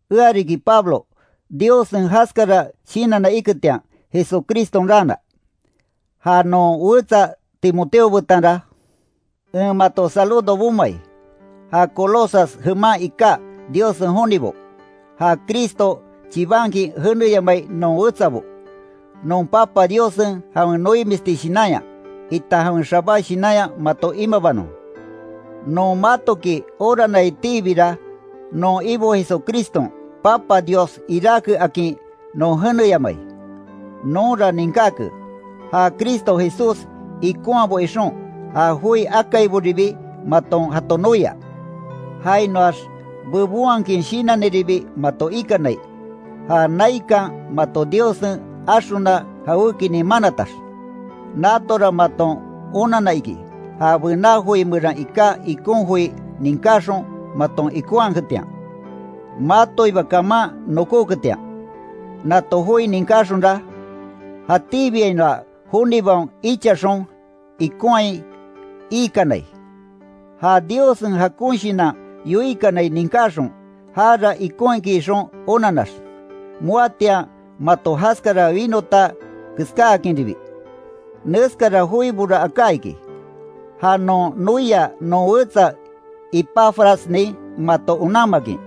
Ea riki Pablo, Diossen jaskara shinanna iketian, Jesucriston raana. Ja non wetsa Timoteo betanra, en mato saludo bomai, ja Colosas jeman iká Diossen jonibo, ja Cristo chibankin jeneyamai non wetsabo. Non Papa Diossen jawen noimisti shinanya, itan jawen xabá shinanya mato imabanon. Non matoki oranaitiibira non Ibo Jesucriston Papa Dios iráke akin non jeneyamai. Nonra ninkáke ja Cristo Jesús ikonhabo ixon, ja joi akaiboribi maton jato noia. Jainoax bebonhakin shinaniribi mato ikanai, ja naikan mato Diossen axona jawékinin manatax. Natora maton onanna iki, ja bená joi meran iká ikon joi ninkáxon maton ikonhaketian, matoiba kaman nokóketian. Nato joi ninkáxonra, jatíbiainoa jonibaon ichaxon ikonhai iikanai. Ja Diossen jakon shinan yoikanai ninkaxon, jara ikon iki ixon onanax, moatian mato jaskara winota keskáakinribi. Neskara joibora aká iki, ja non noia non wetsa Epafrasnin mato onanmakin.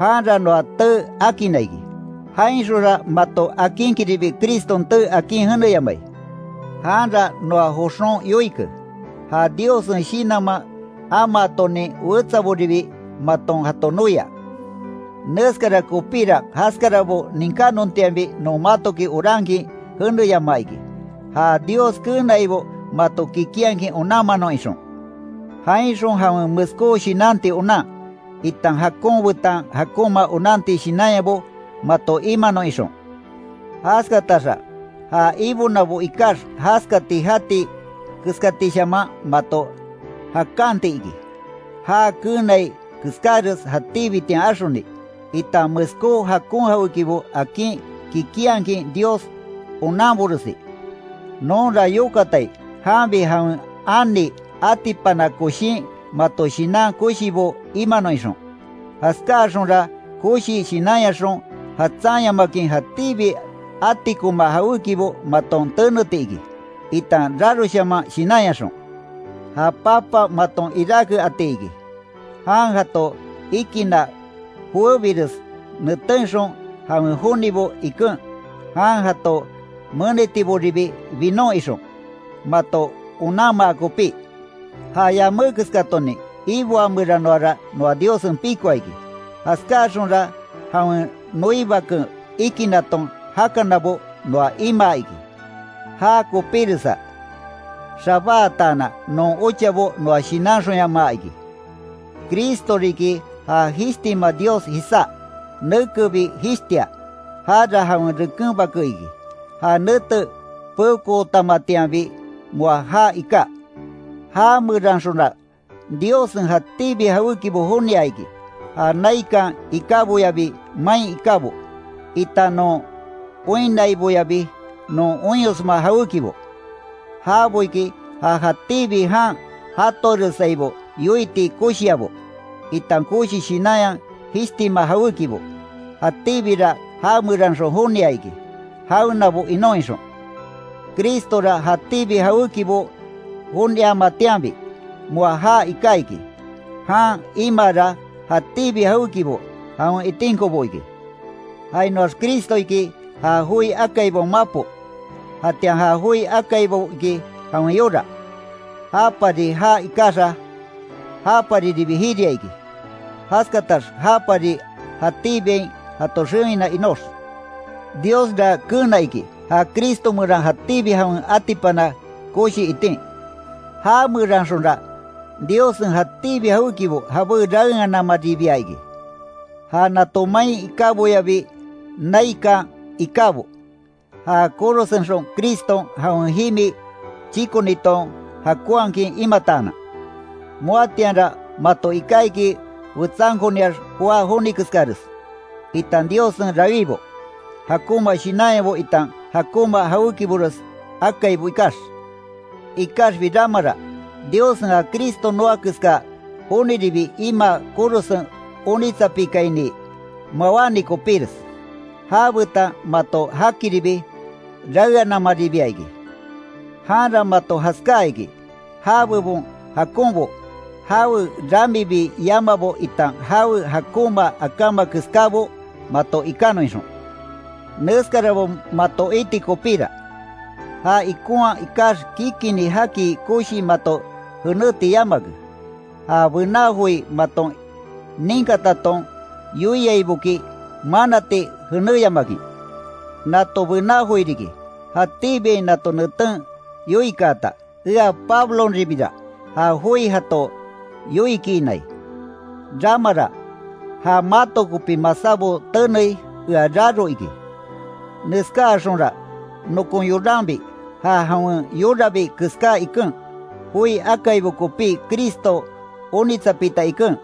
Janra noa tee akinna iki. Jainxonra mato akinkinribi Criston tee akin jeneyamai. Janra noa joxon yoike, ja Diossen Shinanman amaatonin wetsaboribi maton jato noia. Neskara kopíra jaskarabo ninkánontianbi non matoki orankin jeneyamaa iki, ja Dios keenaibo mato kikinhakin onanmanon ixon. Jainxon jawen meskó shinanti onan, itan jakon betan jakonma onanti shinanyabo mato imanon ixon. Jaskataxa, ja Ibonabo ikax jaskati jati keskatishaman mato jakanti iki, já keenai keskáres jatíbitian axoni, itan meskó jakon jawékibo akin kikinhakin Dios onanboresi. Nonra yokatai janbi jawen ani atipana koshin mato shinan koshibo imanon ixon. Jaskáaxonra koshi shinanyaxon jatsanyamakin jatíbi atikoma jawékibo maton teneti iki, itan raroshaman shinanyaxon, ja Papa maton iráke ati iki. Jan jato ikinna joébires netenxon jawen jonibo iken, jan jato menitiboribi binon ixon, mato onanmaa kopí. Ja yamé keskatonin iboa meranoara noa Diossen pikoa iki, jaskáaxonra jawen noi Baken ikinaton jakanabo noa imaa iki. Já kopiresa xabáatanan non ochabo noa shinanxonyamaa iki. Cristo riki ja jishtima Dios jisá, nekebi jishtia. Jara jawen reken Bake iki; ja nete peokootamatianbi moa jaa iká. Jameranxonra Diossen jatíbi jawékibo jonia iki, ja naikan ikáboyabi main ikábo, itan non oinnaiboyabi non oinyosma jawékibo. Jabo iki ja jatíbi jan jatoaresaibo yoiti koshiabo, itan koshi shinanya jishtima jawékibo. Jatíbira jameranxon jonia iki, jawenabo inon ixon. Cristora jatíbi jawékibo joniamatianbi, moa jaa iká iki; jan imaara jatíbi jawékibo jawen itinkobo iki. Jainoax Cristo iki, ja joi akaibaon mapo, jatian ja joi akaibo iki jawen yora. Japari jaa ikaxa, japariribi jiria iki; jaskatax japari jatíbiain jato xewina inox. Diosra keena iki, ja Cristo meran jatíbi jawen atipana koshi itin. Jameranxonra, Diossen jatíbi jawékibo jabé raeananmaribia iki. Ja nato main ikáboyabi naikan ikábo, ja korosenxon Criston jawen jimi chíkoniton jakonhakin imataanan. Moatianra mato iká iki wetsankoniax joá joni keskares, itan Diossen rawíbo. Jakonma shinanyabo itan jakonma jawékibores akaibo ikax. Ikaxbi ramara, Diossen ja Cristo noa keska joniribi imaa korosen onitsapikaini mawáni kopíres, jabetan mato jakiribi raeanamaribia iki. Janra mato jaskáa iki, já bebon jakonbo, jawe ramibi yamaabo itan jawe jakonma akáma keskábo mato ikanon ixon. Neskarabo mato iti kopíra, ja ikonhaa ikax kikini jaki koshii mato jenéti yamake, ja bená joi maton ninkataton yoiaiboki manati jenéyamakin. Nato bená joi riki, jatíbiain nato neten yoikaata, ea Pablonribira ja joi jato yoikiinai. Ramara, ja mato kopi masábo tenei ea raro iki. Neskáaxonra nokon yoranbi ja jawen yorabi keská iken, joi akaibo kopí Cristo onitsapita iken,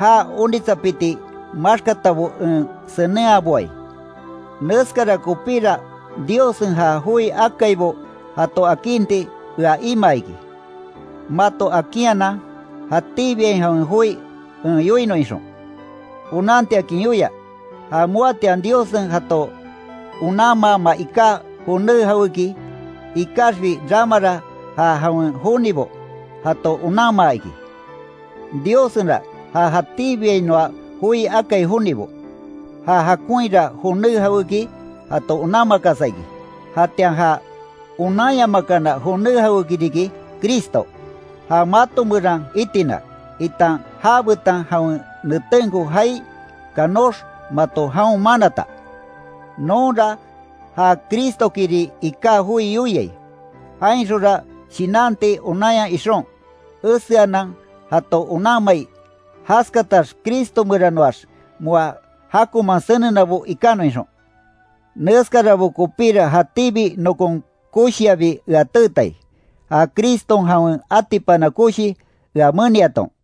já onitsapiti maxkatabo en senenhaboai. Neskara kopíra Diossen ja joi akaibo jato akinti ea imaa iki, mato akinhanan jatíbiain jawen joi en yoinon ixon. Onantiakin yoia, ja moatian Diossen jato onanmaama iká joné jawéki, ikaxbi ramara ja jawen jonibo jato onanmaa iki. Diossenra ja jatíbiainoa joi akai jonibo, ja jakonhira joné jawéki jato onanmakasa iki. Jatian ja onanyamakana joné jawéki riki, Cristo, ja mato meran itina, itan jabetan jawen netenko jaai kanox mato jaon manata. Nonra ja Cristokiri iká joi yoiai, jainxonra shinanti onanya ixon, eseanan jato onanmai, jaskatax Cristo meranoax moa jakonman senenabo ikanon ixon. Neskarabo kopíra jatíbi nokon koshiabi ea teetai, ja Criston jawen atipana koshi ea meniaton.